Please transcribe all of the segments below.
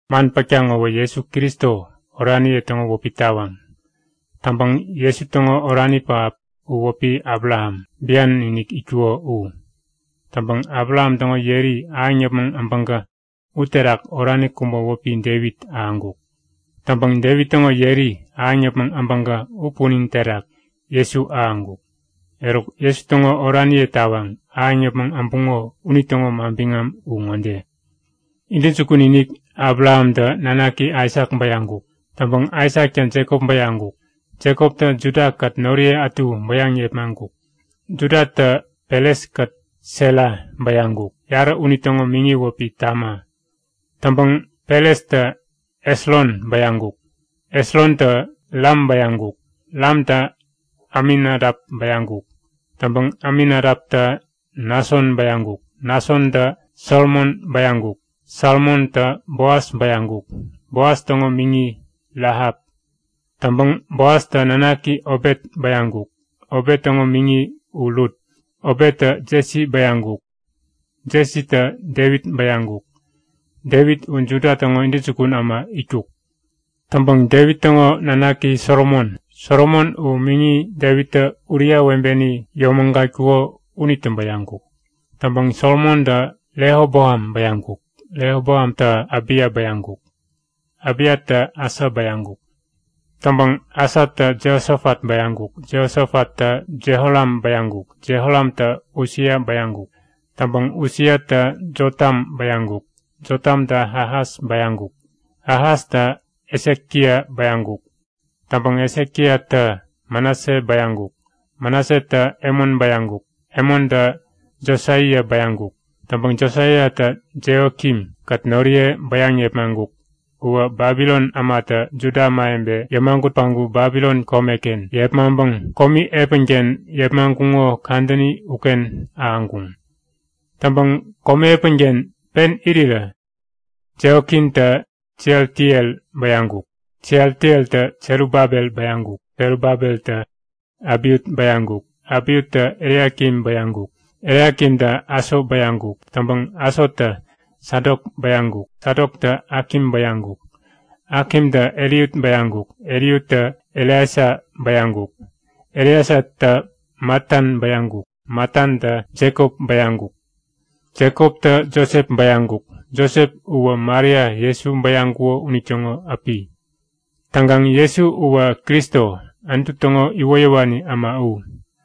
Man pätkaŋ ŋowä Jesu Kristo oraniye täŋo wäpi tawaŋ. Täŋpäŋ Jesu täŋo orani pähap u wäpi Abraham, bian-inik itkuko u. Täŋpäŋ Abraham täŋo yeri ahäŋ yäpmäŋ abäŋkä uterak orani kubä wäpi Devit ahäŋkuk. Täŋpäŋ Devit täŋo yeri ahäŋ yäpmäŋ abäŋkä u punin terak Jesu ahäŋkuk. Eruk Jesu täŋo oraniye tawaŋ ahäŋ yäpmäŋ äbuŋo unitäŋo manbiŋam u ŋode; Intäjukun-inik Abrahamtä nanaki Aisak bäyaŋkuk. Täŋpäŋ Aisaktä Jekop bäyaŋkuk. Jekoptä Judakät noriye ätu bäyaŋ yepmaŋkuk. Judatä Peres-kät Sera bäyaŋkuk. Yarä unitäŋo miŋi wäpi Tama. Täŋpäŋ Perestä Esron bäyaŋkuk. Esrontä Ram bäyaŋkuk. Ramtä Aminadap bäyaŋkuk. Täŋpäŋ Aminadaptä Nason bäyaŋkuk. Nasontä Salmon bäyaŋkuk. Salmontä Boas bäyaŋkuk. Boas täŋo miŋi Rahap. Täŋpäŋ Boastä nanaki Obet bäyaŋkuk. Obet täŋo miŋi u Rut. Obettä Jesi bäyaŋkuk. Jesitä Devit bäyaŋkuk. Devit u Juda täŋo intäjukun äma itkuk. Täŋpäŋ Devit täŋo nanaki Solomon. Solomon u miŋi Devittä Uria webeni yomägatkuko unitä bäyaŋkuk. Täŋpäŋ Solomontä Rehoboam bäyaŋkuk. Rehoboamtä Abiya bäyaŋkuk. Abiyatä Asa bäyaŋkuk. Täŋpäŋ Asatä Jehosofat bäyaŋkuk. Jehosofattä Jehoram bäyaŋkuk. Jehoramtä Usia bäyaŋkuk. Täŋpäŋ Usiatä Jotam bäyaŋkuk. Jotamtä Ahas bäyaŋkuk. Ahastä Hesekia bäyaŋkuk. Täŋpäŋ Hesekiatä Manase bäyaŋkuk. Manasetä Emon bäyaŋkuk. Emontä Josaia bäyaŋkuk. Täŋpäŋ Josaiatä Jehokin-kät noriye bäyaŋ yepmaŋkuk. Uwä Babilon ämatä Juda ämawebe yämagut päŋku Babilon komeken yepmaŋpäŋ komi epänken yepmaŋkuŋo kadäni uken ahäŋkuŋ. Täŋpäŋ komi epänken pen irirä Jehokintä Sealtiel bäyaŋkuk. Sealtieltä Serubabel bäyaŋkuk. Serubabeltä Abiut bäyaŋkuk. Abiuttä Eliakim bäyaŋkuk. Eliakimtä Aso bäyaŋkuk. Täŋpäŋ Asotä Sadok bäyaŋkuk. Sadoktä Akim bäyaŋkuk. Akimtä Eliut bäyaŋkuk. Eliuttä Eleasa bäyaŋkuk. Eleasatä Matan bäyaŋkuk. Matantä Jekop bäyaŋkuk. Jekoptä Josep bäyaŋkuk. Josep uwä Maria Jesu bäyaŋkuko unitäŋo äpi. Täŋkaŋ Jesu uwä Kristo, Anutu täŋo iwoyäwani äma u.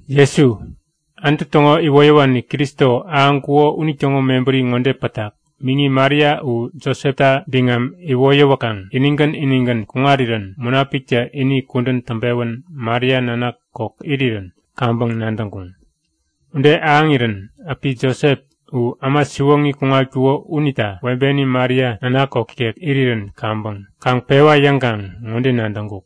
Jesu, Anutu täŋo iwoyäwani Kristo ahäŋkuko unitäŋo mebäri ŋode pätak; Miŋi Maria u Josepta biŋam iwoyäwäkaŋ inigän inigän kuŋarirän Munapiktä ini kudän täŋpewän Maria nanak kok irirän kaŋpäŋ nadäŋkuŋ. Ude ahäŋirän äpi Josep u äma siwoŋi kuŋatkuko unita webeni Maria nanak kok ikek irirän kaŋpäŋ kaŋ pewa yäŋkaŋ ŋode nadäŋkuk;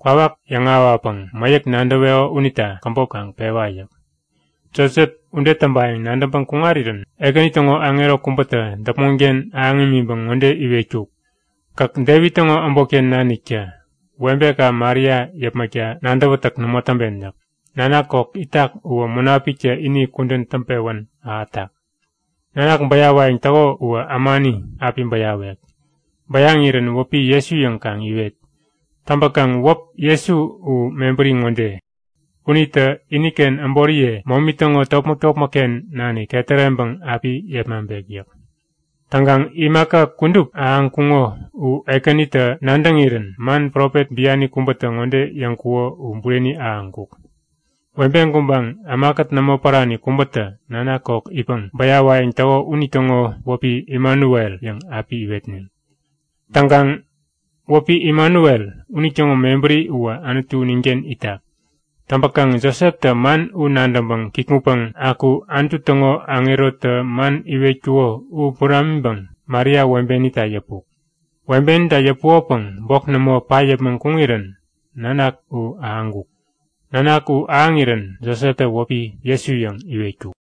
Kwawak yäŋahäwapäŋ mäyäk nadäweko unita käbop kaŋ pewa yäk. Josep ude täŋpayäŋ nadäŋpäŋ kuŋarirän, Ekäni täŋo aŋero kubätä däpmonken ahäŋ imiŋpäŋ ŋode iwetkuk; Gäk Devit täŋo äbotken naniktä webeka Maria yäpmäkta nadäwätäk nämo täŋpen yäk. Nanak kok itak uwä Munapiktä ini kudän täŋpewän ahätak. Nanak bäyawayäŋ täko uwä ämani api bäyawek. Bäyaŋirän wäpi Jesu yäŋ kaŋ iwet. Täŋpäkaŋ wäp Jesu u mebäri ŋode; Unitä iniken äboriye momi täŋo topmäk-topmäkken nanik ketäreŋpäŋ api yepmaŋpek yäk. Täŋkaŋ imaka kudup ahäŋkuŋo u Ekänitä nadäŋirän man profet biani kubätä ŋode yäŋkuko u bureni ahäŋkuk; Webe gubaŋ, ämakät nämo pärani kubätä nanak kok itpäŋ bäyawayäŋ täko unitäŋo wäpi “Imanuel” yäŋ api iwetneŋ. Täŋkaŋ wäpi “Imanuel” unitäŋo mebäri uwä Anutu ninken itak. Täŋpäkaŋ Joseptä man u nadäŋpäŋ kikŋutpäŋ aku Anutu täŋo aŋerotä man iwetkuko u buramiŋpäŋ Maria webenita yäpuk. Webenita yäpukopäŋ bok nämo pat yäpmäŋ kuŋirän nanak u ahäŋkuk. Nanak u ahäŋirän Joseptä wäpi “Jesu” yäŋ iwetkuk.